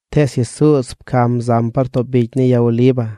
Tees Jesuuz pcam zam par too bicy ni ya Oliva.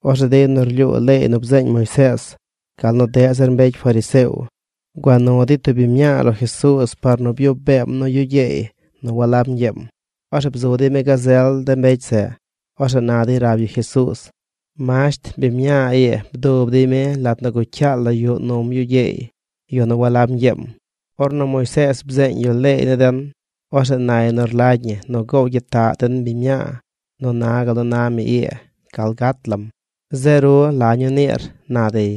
Orzeꞌ de yu nu rlyuu leey nu bzeeñ Moisees, gal nu deꞌ zir mbecy fariseo, gua nu dey tub biñ mñaa lo Jesuuz par nu byuꞌ beem nu yu gyeey nu walab ñgyeem. Orzeꞌ bzu dey mi gazel de mbecy zeꞌ. Orzeꞌ na dey rab yu Jesuuz: ―Masht, biñ mñaa ii bdub dey mi lat nu gucyaal la yuꞌ num yu gyeey, yu nu walab ñgyeem. Ornu Moisees bzeeñ yu leey ni den, orzeꞌ nay nu rlagy ñi nu gow gyitaꞌ den biñ mñaa nu na gal nu na mi ii gal gat lam. Zeꞌ ru, ¿la ñuu niir? ―na dey.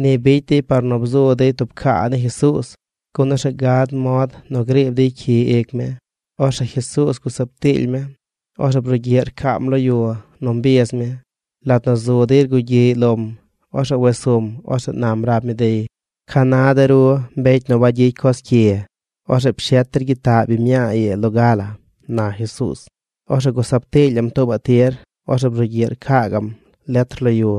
Ni bicy dey par nu bzu dey tub caa ni Jesuuz, gun orzeꞌ gad mod nu griib dey cyi ic mi. Orzeꞌ Jesuuz gusab tiily mi. Orzeꞌ brugyiꞌ rcaam lo yu nu mbiz mi. Lat nu zu dey rgugyiꞌy lom, orzeꞌ wes sum. Orzeꞌ nam rab mi dey: ―Ca na de ru, mbecy nu wangyicy coz cyi, orzeꞌ pshet der gyitaꞌ biñ mñaa ii loga la ―na Jesuuz. Orzeꞌ gusab tiilyaꞌm tuubaꞌ tir. Orzeꞌ brugyiꞌ rcaa gaꞌm letr lo yu.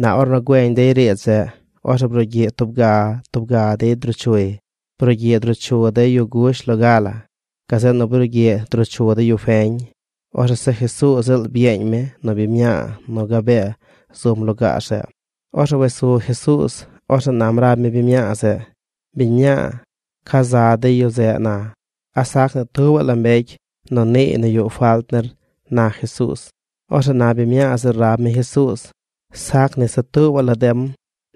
Na ornu güeñ dey riidz zeꞌ, orzeꞌ brugyiꞌ tub ga, tub ga dey druu chuy. Brugyiꞌ druu chu de yu gush loga la. Gazeꞌ nu brugyiꞌ druu chu de yu feñ. Orzeꞌ se Jesuuz ziꞌl byeeñ mi nu biñ mñaa nu gabee zum lugaar zeꞌ. Orzeꞌ wes su Jesuuz. Orzeꞌ nam rab mi biñ mñaa zeꞌ: ―Biñ mñaa, ¿ca za de yu zeꞌ na? ¿A sac ni tubaꞌ la mbecy nu niiy nu yuꞌ falt nir? ―na Jesuuz. Orzeꞌ na biñ mñaa zeꞌ rab mi Jesuuz: ―Sac ni se tubaꞌ la dem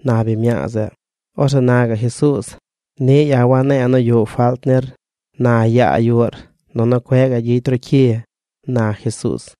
―na biñ mñaa zeꞌ. Orzeꞌ na gaꞌ Jesuuz: ―Niꞌ ya̱ wane̱e̱ nu yuꞌ falt nir. Na yaa yuꞌr, nunu cueꞌ gaꞌ gyicy ru cyi ―na Jesuuz.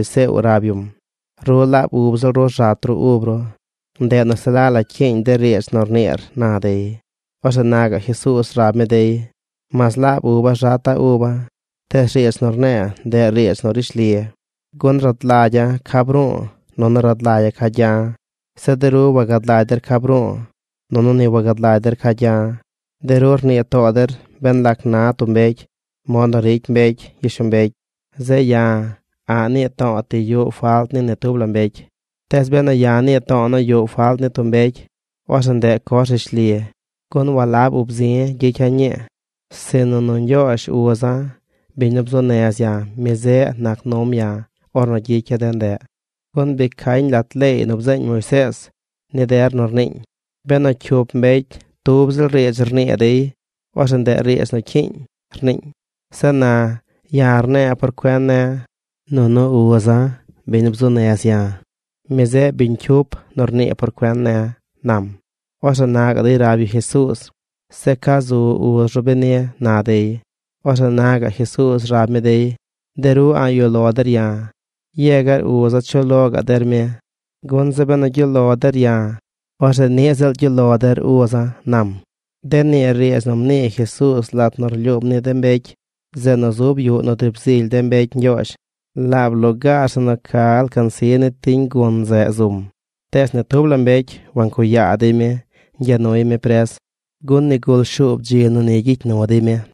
Orzeꞌ na de mbecy fariseo rab yum: ―Ru laab ub ziꞌl ru rzat ru ub ru, ndeꞌ nu se la la cyiiñ de riidz nu rniir ―na dey. Orzeꞌ na gaꞌ Jesuuz rab mi dey: ―Mas laab uba̱ rzata̱ uba̱, tees riidz nu rne̱e̱ ndeꞌ riidz nu rishli. Gun rad lagya̱ ca bru̱u̱, nunu rad lagya̱ ca gya̱. Zeꞌ de ru wagad lagy der ca bru̱u̱, nunu ni wagad lagy der ca gya̱. De ru rnii too der ben lac na tub mbecy mod nu ricy mbecy gyishlombecy. Zeꞌ ya̱, a̱ꞌ nii to̱o̱ ti yuꞌ falt ni ni tub la mbecy. Tees benu ya̱ nii to̱o̱ nu yuꞌ falt ni tub mbecy, orzeꞌ ndeꞌ coz rishli, gun walab ub zi̱ gyicya̱ ñii, sinu nu Ñgyoozh uza̱, biñ nu bzuu nez ya̱, mi zeꞌ nac num ya̱ ornu gyicya̱ de ndeꞌ. Gun bi cañ lat leey nu bzeeñ Moisees ni der nu rniiñ: “Benu cyup mbecy tub ziꞌl riidz rnii dey, orzeꞌ ndeꞌ riidz nu cyiiñ”, rniiñ. Zeꞌ na, ya̱ rne̱e̱ por cuen ne̱. Nunu uza̱, biñ nu bzuu nez ya̱, mi zeꞌ biñ cyup nu rnii por cuen ne̱ ―nam. Orzeꞌ na gaꞌ dey rab yu Jesuuz: ―¿Zeꞌ ca zu uz ru beni? ―na dey. Orzeꞌ na gaꞌ Jesuuz rab mi dey: ―De ru a̱ꞌ yuꞌ lo der ya̱. Yegar uza̱ chuꞌ lo gaꞌ der mi. Gun zeꞌ benu gyuꞌ lo der ya̱, orzeꞌ niꞌ ziꞌl gyuꞌ lo der uza̱ ―nam. De nii riidz nu mnii Jesuuz lat nu rlyuum ni de mbecy zeꞌ nu zub yuꞌ nu driib zily de mbecy Ñgyoozh. Laab lugaar zeꞌ nu ca alcansi ni tiñ gun zeꞌ zum. Tees ni tub la mbecy wancuꞌ yaa dey mi ñgya nuy mi pres, gun nigul shuub dzi nu ni gyicy nu dey mi.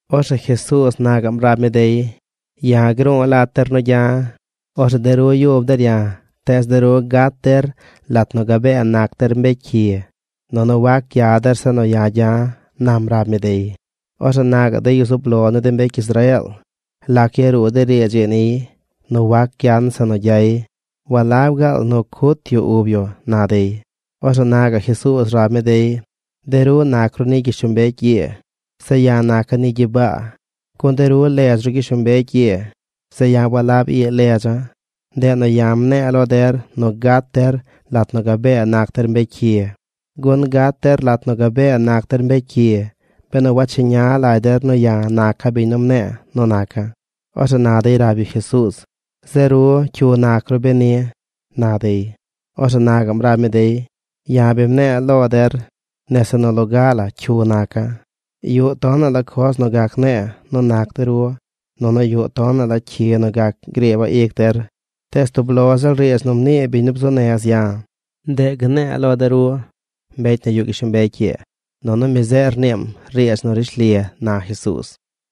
Orzeꞌ Jesuuz na gaꞌm rab mi dey: ―Ya̱ gru̱u̱ lat der nu gya̱. Orzeꞌ de ru yub der ya̱, tees de ru gat der lat nu gabee nac der mbecy cyi. Nunu wac gya der zeꞌ nu ya̱ gya̱ ―nam rab mi dey. Orzeꞌ na gaꞌ de yu zub lo ni de mbecy Israeel: ―¿Lac yaruu de riidz ii niy nu wac gyan zeꞌ nu gyay? ¿Walab gaal nu cut yu ub yu? ―na dey. Orzeꞌ na gaꞌ Jesuuz rab mi dey: ―De ru nac ru ni gyishlombecy ii. Zeꞌ ya̱ naca̱ ni gyibaa, gun de ru ledz ru gyishlombecy ii. Zeꞌ ya̱ walab ii ledza̱. Ndeꞌ nu ya̱ mne̱e̱ lo der nu gat der lat nu gabee nac der mbecy cyi. Gun gat der lat nu gabee nac der mbecy cyi benu wacheña lagy der nu ya̱ naca̱ biñ nu mne̱e̱ nu naca̱. Orzeꞌ na dey rab yu Jesuuz: ―¿Zeꞌ ru, cyu nac ru beni? ―na dey. Orzeꞌ na gaꞌm rab mi dey: ―Ya̱ bi mne̱e̱ lo der nese nu loga la cyu naca̱. Yuꞌ tonaꞌ la coz nu gac ne̱e̱ nu nac de ru, nunu yuꞌ tonaꞌ la cyi nu gac griiba̱ ic der, tees tub lo ziꞌl riidz nu mnii biñ nu bzuu nez ya̱, ndeꞌ gne̱e̱ lo de ru, mbecy nu yuꞌ gyishlombecy ii. Nunu mi zeꞌ rniim riidz nu rishli ―na Jesuuz.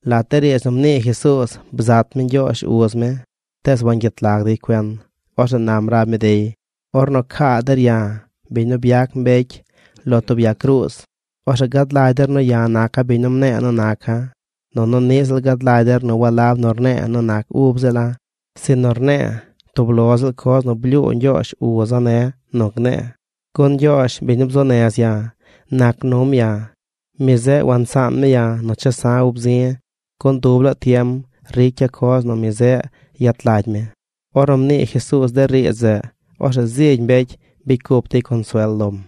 Lat de riidz nu mnii Jesuuz, bzat mi Ñgyoozh uz mi, tees wangyet lag dey cuen. Orzeꞌ nam rab mi dey: ―Ornu caa der ya̱, biñ nu byac mbecy, lo tub ya cruuz, orzeꞌ gad lagy der nu ya̱ naca̱ biñ nu mne̱e̱ nu naca̱. Nunu niꞌ ziꞌl gad lagy der nu walab nu rne̱e̱ nu nac ub ziꞌl la̱, sinu rne̱e̱ tub lo ziꞌl coz nu blyuu Ñgyoozh uza̱ ne̱ nu gne̱e̱. Gun Ñgyoozh, biñ nu bzuu nez ya̱, nac num ya̱. Mi zeꞌ wansaan mi ya̱ nu chesa̱ ub zi̱ gun dub laa tiem ricya̱ coz nu mi zeꞌ yet lagy mi. Ornu mnii Jesuuz de riidz zeꞌ, orzeꞌ zigy mbecy bicy cup dey consuel lom.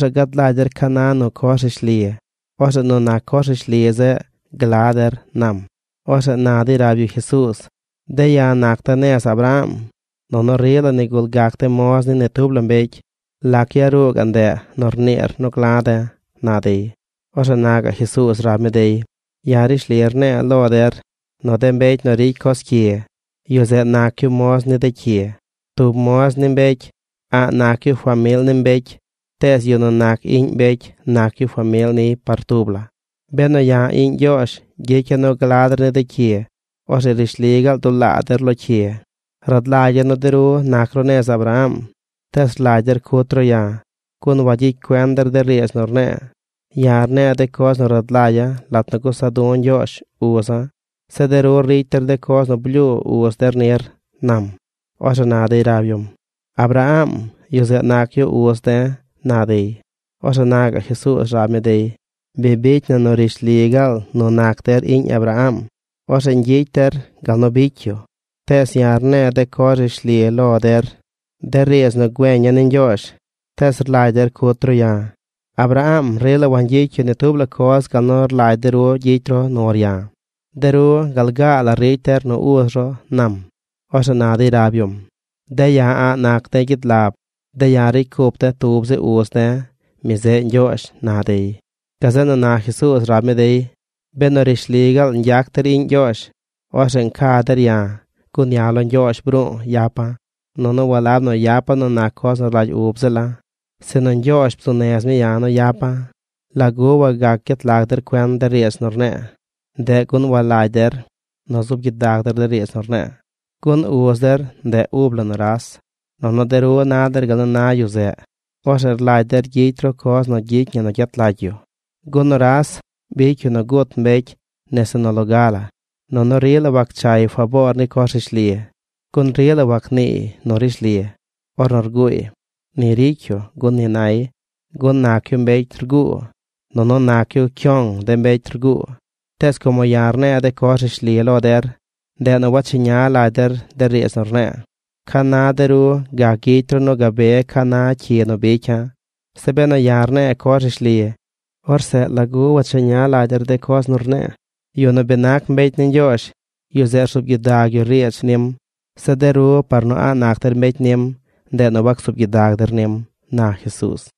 Orzeꞌ gad lagy der ca na nu coz rishli. Orzeꞌ nu nac coz rishli zeꞌ gla der ―nam. Orzeꞌ na dey rab yu Jesuuz: ―De̱ ya̱ nac de̱ nez Abraham, nunu rila nigul gac de̱ moz ni ni tub la mbecy. ¿Lac yaruu gaꞌ ndeꞌ nu rniir nu gla̱ de̱? ―na dey. Orzeꞌ na gaꞌ Jesuuz rab mi dey: ―Ya̱ rishli rne̱e̱ lo der nu de mbecy nu ricy coz cyi, yu zeꞌ nac yu moz ni de cyi. Tub moz ni mbecy, a̱ꞌ nac yu famil ni mbecy tees yu nu nac iꞌñ mbecy nac yu famil niy par tub la. Benu ya̱ iꞌñ Ñgyoozh gyicya̱ nu gla der ni de cyi, orzeꞌ rishli gaal dulaa der lo cyi. Rad lagya̱ nu de ru nac ru nez Abraham, tees rlagy der cut ru ya̱, gun wayicy cuen der de riidz nu rne̱e̱. Ya̱ rne̱e̱ de coz nu rad lagya̱ lat nu gusa du̱ Ñgyoozh uza̱. Zeꞌ de ru ricy der de coz nu blyuu uz der nir ―nam. Orzeꞌ na dey rab yum: ―¡Abraham, yu zeꞌ nac yu uz de̱! ―na dey. Orzeꞌ na gaꞌ Jesuuz rab mi dey: ―Bi bicy na nu rishli gaal nu nac der iꞌñ Abraham, orzeꞌ ñgyicy der gal nu bicy yu. Tees ya̱ rne̱e̱ de coz rishli lo der, de riidz nu güeña̱ ni Ñgyoozh, tees rlagy der cut ru ya̱. ¡Abraham rila wangyicy yu ni tub la coz gal nu rlagy de ru gyicy ru nur ya̱! De ru gal gaa la ricy der nu uz ru ―nam. Orzeꞌ na dey rab yum: ―De̱ ya̱ a̱ꞌ nac de̱ gyid lab. De̱ ya̱ ricy cup de̱ tub zi uz de̱. Mi zeꞌ Ñgyoozh ―na dey. Gazeꞌ nu na Jesuuz rab mi dey: ―Benu rishli gaal ñgyac der iꞌñ Ñgyoozh, orzeꞌ nca der ya̱, gun ya̱ lo Ñgyoozh bru̱u̱ yapa̱. Nunu walab nu yapa̱ nu nac coz nu rlagy ub ziꞌl la̱, sinu Ñgyoozh bzuu nez mi ya̱ nu yapa̱. ¿Lagu wagac gyet lag der cuen de riidz nu rne̱e̱? Ndeꞌ gun walagy der nu zuub gyidag der de riidz nu rne̱e̱. Gun uz der, ndeꞌ ub la nuras. Nunu de ru na der gal nu na yu zeꞌ. Orzeꞌ rlagy der gyicy ru coz nu gyicy ñi nu gyet lagy yu. Gun nuras bicy yu nu gut mbecy nese nu loga la. Nunu rila wagchay faboor ni coz rishli, gun rila wagniiy nu rishli. Ornu rguuy, ni ricy yu gun ni nay, gun nac yu mbecy rguu. Nunu nac yu cyoong de mbecy rguu. Tees como ya̱ rne̱e̱ de coz rishli lo der, ndeꞌ nu wacheña lagy der de riidz nu rne̱e̱. ¿Ca na de ru gac gyicy ru nu gabe ca na cyi nu bicya̱? Zeꞌ benu ya̱ rne̱e̱ coz rishli, orzeꞌ ¿lagu wacheña lagy der de coz nu rne̱e̱? Yu nu bi nac mbecy ni Ñgyoozh, yu zeꞌ rzuub gyidag yu riidz nim. Zeꞌ de ru par nu a̱ꞌ nac der mbecy nim, ndeꞌ nu wacsuub gyidag der nim ―na Jesuuz.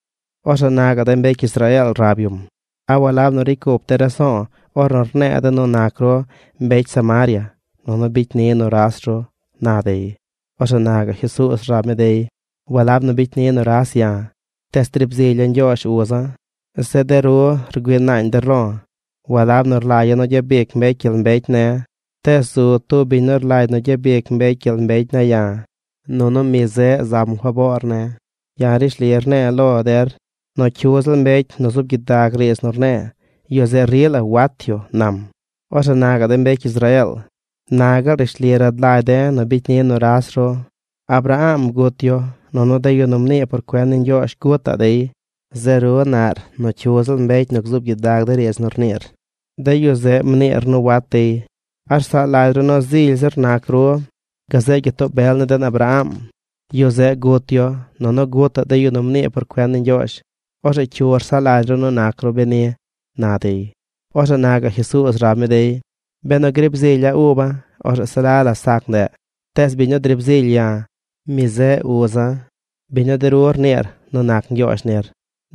Orzeꞌ na gaꞌ de mbecy Israeel rab yum: ―¿A walab nu ricy cup de̱ raso̱o̱ ornu rne̱e̱ de̱ nu nac ru mbecy Samaria, nunu bicy ni nuras ru? ―na dey. Orzeꞌ na gaꞌ Jesuuz rab mi dey: ―Walab nu bicy ni nuras ya̱. Tees driib zilya̱ Ñgyoozh uza̱. Zeꞌ de ru rgüii naañ der lo̱. Walab nu rlagya̱ nu gyabic mbecy gyel mbecy ne̱, tees zu tub biñ nu rlagy nu gyabic mbecy gyel mbecy ne̱ ya̱, nunu mi zeꞌ zam faboor ne̱. Ya̱ rishli rne̱e̱ lo der nu cyu ziꞌl mbecy nu zuub gyidag riidz nu rne̱e̱, yu zeꞌ rila wat yu ―nam. Orzeꞌ na gaꞌ de mbecy Israeel: ―Na gaal rishli rad lagy de̱ nu bicy ni nuras ru. Abraham gut yu, nunu de yu nu mnii por cuen ni Ñgyoozh gutaꞌ dey. Zeꞌ ru naꞌr nu cyu ziꞌl mbecy nu gzuub gyidag de riidz nu rniir, de yu zeꞌ mniir nu wat dey. ¿A rsaꞌ lagy ru nu zily zir nac ru gazeꞌ gyitoo bel ni den Abraham? Yu zeꞌ gut yu. Nunu gutaꞌ de yu nu mnii por cuen ni Ñgyoozh. ¿Orzeꞌ cyu rsaꞌ lagy ru nac ru beni? ―na dey. Orzeꞌ na gaꞌ Jesuuz rab mi dey: ―Benu griib zilya̱ uba̱, orzeꞌ se la la sac ndeꞌ. Tees biñ nu driib zilya̱, mi zeꞌ uza̱, biñ nu de ru rniir nu nac Ñgyoozh nir.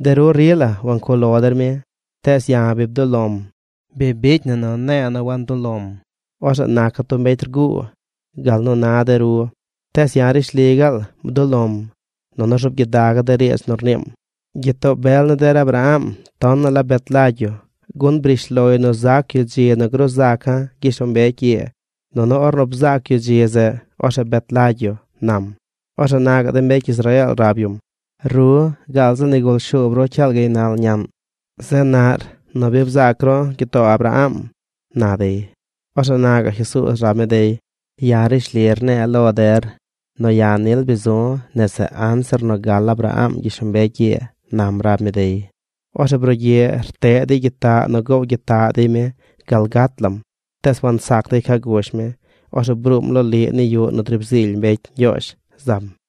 De ru rila wancuꞌ lo der mi, tees ya̱ bi bduꞌ lo̱m. Bi bicy na nu ne̱e̱ nu wantuꞌ lo̱m, orzeꞌ naca̱ tub mbecy rguu gal nu na de ru. Tees ya̱ rishli gaal bduꞌ lo̱m, nunu rzuub gyidaga̱ de riidz nu rniim. Gyitoo bel ni der Abraham tonaꞌ la bet lagy yu, gun briish loy nu zac yu dzi nu gruu zaca̱ gyishlombecy ii, nunu ornu bzaac yu dzi zeꞌ, orzeꞌ bet lagy yu ―nam. Orzeꞌ na gaꞌ de mbecy Israeel rab yum: ―Ru, gaal zi nigul shuub ru cyaal gaynal ñaꞌn, zeꞌ naꞌr nu bi bzaac ru gyitoo Abraham ―na dey. Orzeꞌ na gaꞌ Jesuuz rab mi dey: ―Ya̱ rishli rne̱e̱ lo der nu ya̱ nil bi zu̱ nese anzir nu gal Abraham gyishlombecy ii ―nam rab mi dey. Orzeꞌ brugyiꞌ rteꞌ dey gyitaꞌ nu gow gyitaꞌ dey mi gal gat lam. Tees wansac dey ca gush mi. Orzeꞌ bruum loliꞌ ni yuꞌ nu driib zily mbecy Ñgyoozh zam.